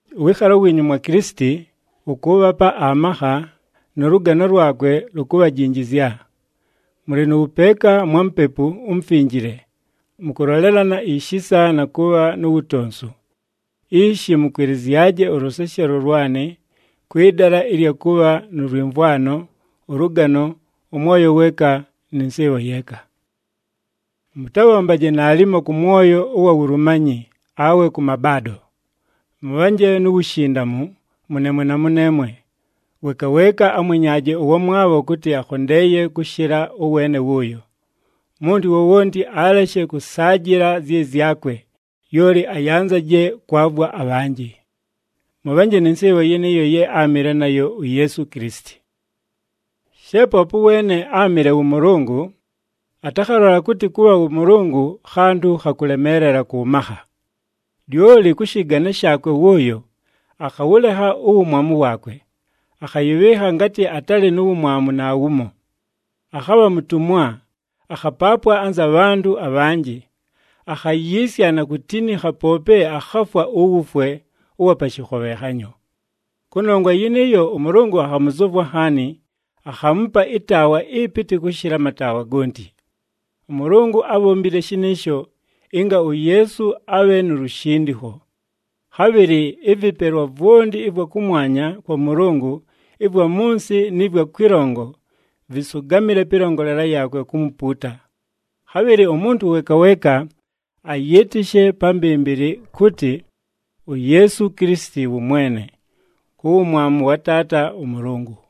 Ʉwɨɨkhalo wiinyu mwa Kilisiti wʉkʉʉbhapa amakha, nʉ lʉgano lwakwe lukubhajinjizya. Mʉlɨ nʉ wʉpeeka mwa Mupepu uMufinjile, mʉkʉlolelana ishisa na kʉbha nu wutonsu. Ishi mʉkwɨlɨzyaje ʉlʉseshelo lwanɨ, kwɨ dala ɨlya kʉbha nʉ lwɨmvwano, ʉlʉgano, ʉmwoyo weeka, nɨ nsɨɨbho yeeka. Mʉtabhombaje naalimo kʉ mwoyo ʉwa wulumanyi awe kʉ mabaado. Mʉbhanje nu wushindamu mʉneemwe na mʉneemwe, weeka weeka amwenyaaje ʉwamwabho kʉtɨ akhondeeye kʉshɨla ʉweene wʉʉyo. Umuntu wowonti aleshe kʉsaajɨla zyɨ zyakwe, lyoli ayanzaje kwavwa abhanjɨ. Mʉbhanje nɨ nsɨɨbho yɨnɨɨyo ye áamɨle nayo uYeesu Kilisiti. She poope ʉweene áamɨle wʉ Mʉlʉngʉ, atakhalola kʉtɨ kʉbha wʉ Mʉlʉngʉ, khantʉ kha kʉlemeelela kʉ makha. Lyoli kʉ shɨgane shaakwe wʉʉyo, akhawʉlekha uwumwamu waakwe, akhayɨbhɨɨkha ngatɨ atalɨ nu wumwamu naawumo. Akhabha mutumwa, akhapaapwa anza bhantʉ abhanjɨ. Akhayiisya na kutinikha, poope akhafwa uwufwe ʉwa pa shɨkhobhenhanyo. Kʉnongwa yɨnɨɨyo, ʉMʉlʉngʉ akhamʉzʉvwa nhaani, akhaamupa ɨtaawa ɨpɨtɨ kʉshɨla amataawa gonti. ɄMʉlʉngʉ ábhombile shɨnɨɨsho, ɨnga uYeesu abhe nu lushindikho. Khabhɨlɨ ɨvɨpelwa vwonti ɨvwa kʉmwanya kwa Mʉlʉngʉ, ɨvwa mʉ nsɨ nɨ vwa kwɨlongo, vɨsʉgamɨle pɨlongolela yaakwe kumupuuta. Khabhɨlɨ umuntu weeka weeka ayɨɨtɨshe pa mbɨmbɨlɨ kʉtɨ, uYeesu Kilisiti wʉ Mwene, ku wumwamu wa Taata ʉMʉlʉngʉ.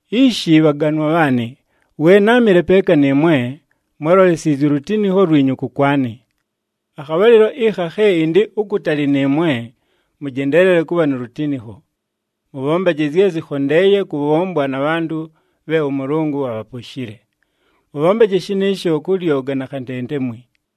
Ishi bhaganwa bhaanɨ, we náamɨle peeka nɨɨmwe, mwálolesiizye ulutinikho lwinyu kʉkwanɨ. Akhabhalɨlo ɨkha khe ɨndɨ ukutali nɨɨmwe, mʉjendeelele kʉbha nu lutinikho. Mʉbhombaje zye zɨkhondeeye kʉbhombwa na bhantʉ bhe ʉMʉlʉngʉ abhaposhile. Mʉbhombaje shɨnɨɨsho kʉ lyoga na khantentemwi.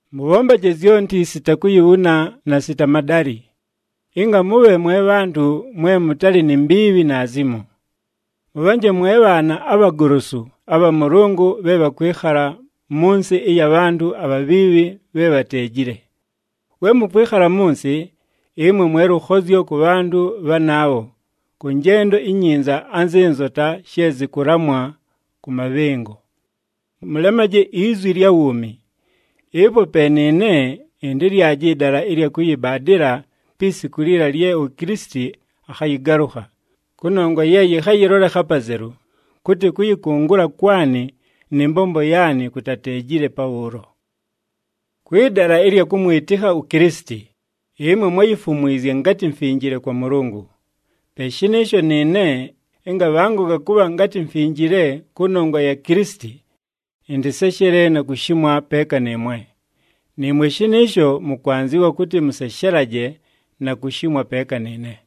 Mʉbhombaje zyonti sita kuyibhuna na sita madalɨ, ɨnga mʉbhe mwe bhantʉ mwe mʉtalɨ ni mbiibhi naazimo. Mʉbhanje mwe bhaana abhagolosu abha Mʉlʉngʉ bhe bhakwɨkhala mʉ nsɨ ɨya bhantʉ abhabhiibhi bhe bhateejile. We mʉkwɨkhala mʉ nsɨ, ɨmwe mwe lʉkhozyo kʉ bhantʉ bhanaabho kʉ njendo inyinza anzɨ nzota she zɨkʉlamwa kʉ mabhɨngo. Mʉlemaje izwi lya wuumi. Ɨpo pe nɨɨne ɨntɨlyaje ɨdala ɨlya kʉyɨbaadɨla pi siku liila lye uKilisiti akhayɨgalʉkha, kʉnongwa ye yɨkhayɨlolekha apazelu kʉtɨ kʉyɨkʉngʉla kwanɨ nɨ mbombo yaanɨ kutateejile pabhʉʉlo. Kwɨ dala ɨlya kʉmwɨtɨkha uKilisiti, ɨmwe mwáyifumwizye ngatɨ mfinjile kwa Mʉlʉngʉ. Pe shɨnɨɨsho nɨɨne ɨnga bhangoga kʉbha ngatɨ mfinjile kʉnongwa ya Kilisiti, ɨntɨseshele na kushimwa peeka nɨɨmwe. Nɨɨmwe shɨnɨɨsho mʉkwanzɨwa kʉtɨ mʉseshelaje, na kushimwa peeka nɨɨne.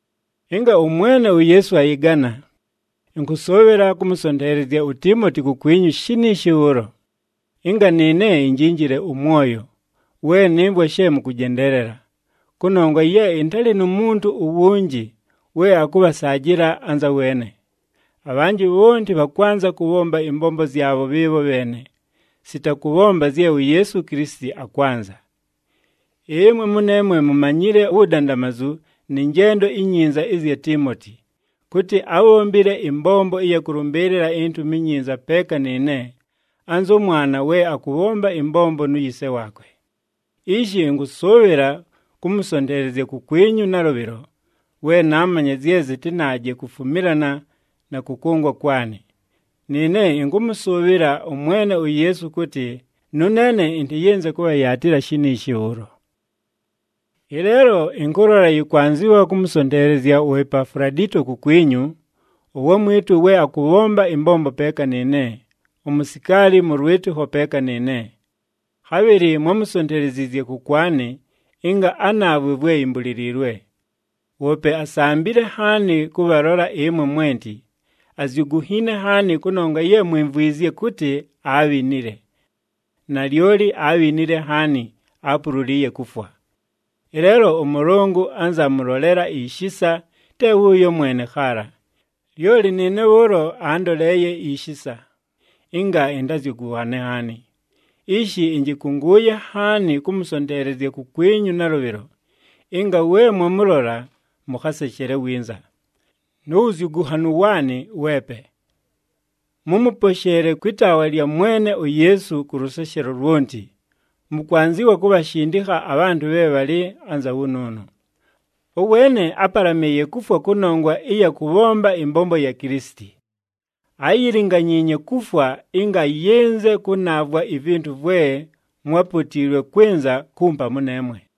Ɨnga ʉMwene uYeesu ayɨgana, ɨnkʉsʉʉbhɨla kʉmʉsonteelezya uTiimoti kukwinyu shiniishi bhʉʉlo, ɨnga nɨɨne injinjile ʉmwoyo, we nɨmvwa she mʉkʉjendeelela. Kʉnongwa ye ɨntalɨ nu muntu uwunji we akʉbhasaajɨla anzʉ weene. Abhanjɨ bhonti bhakwanza kʉbhomba ɨmbombo zyabho bhɨɨbho bheene, sita kʉbhomba zye uYeesu Kilisiti akwanza. Ɨmwe mʉneemwe mumanyile uwudandamazu nɨ njendo inyinza ɨzya Tiimoti, kʉtɨ ábhombile ɨmbombo ɨya kʉlʉmbɨɨlɨla iNtumi iNyinza peeka nɨɨne, anzʉ mwana we akʉbhomba ɨmbombo nu yise waakwe. Ishi ɨnkʉsʉʉbhɨla kʉmʉsonteelezya kukwinyu nalʉbhɨlo, we naamanya zye zɨtɨnaaje kufumilana na kʉkʉngwa kwanɨ. Nɨɨne ɨnkʉmʉsʉʉbhɨla ʉMwene uYeesu kʉtɨ, nʉneene ɨntɨyɨnze kʉbhayaatɨla shiniishi bhʉʉlo. Ɨleelo ɨnkʉlola yɨkwanzɨwa kʉmʉsonteelezya uEpafuladito kukwinyu, ʉwamwɨtʉ we akʉbhomba ɨmbombo peeka nɨɨne, umusikaali mʉ lwɨtɨkho peeka nɨɨne. Khabhɨlɨ mwámusonteleziizye kʉkwanɨ, ɨnga anaavwe vwe imbuliliilwe. Woope asambile nhaani kʉbhalola ɨmwe mwenti, azyugunhiine nhaani kʉnongwa ye mwimvwizye kʉtɨ aabhinile. Nalyoli aabhinile nhaani, aapululiiye kufwa. Ɨleelo ʉMʉlʉngʉ anza amʉlolela ishisa, te wʉʉyo mwene khaala, lyoli nɨɨne bhʉʉlo aandoleeye ishisa, ɨnga ɨntazyʉgʉnhane nhaani. Ishi ɨnjɨkʉngʉʉye nhaani kʉmʉsonteelezya kukwinyu nalʉbhɨlo, ɨnga we mwamʉlola, mʉkhaseshele winza, nu wuzyugunhanu waanɨ weepe. Mʉmʉposheele kwɨ taawa lya Mwene uYeesu kʉ lʉseshelo lwonti. Mʉkwanzɨwa kubhashindikha abhantʉ bhe bhalɨ anza wʉnʉʉnʉ. Ʉweene ápalamɨɨye kufwa kʉnongwa ɨya kʉbhomba ɨmbombo ya Kilisiti. Áyilinganyiinye kufwa ɨnga ayɨnze kʉnaavwa ivintu vwe mwápotiilwe kwɨnza kumpa mʉneemwe.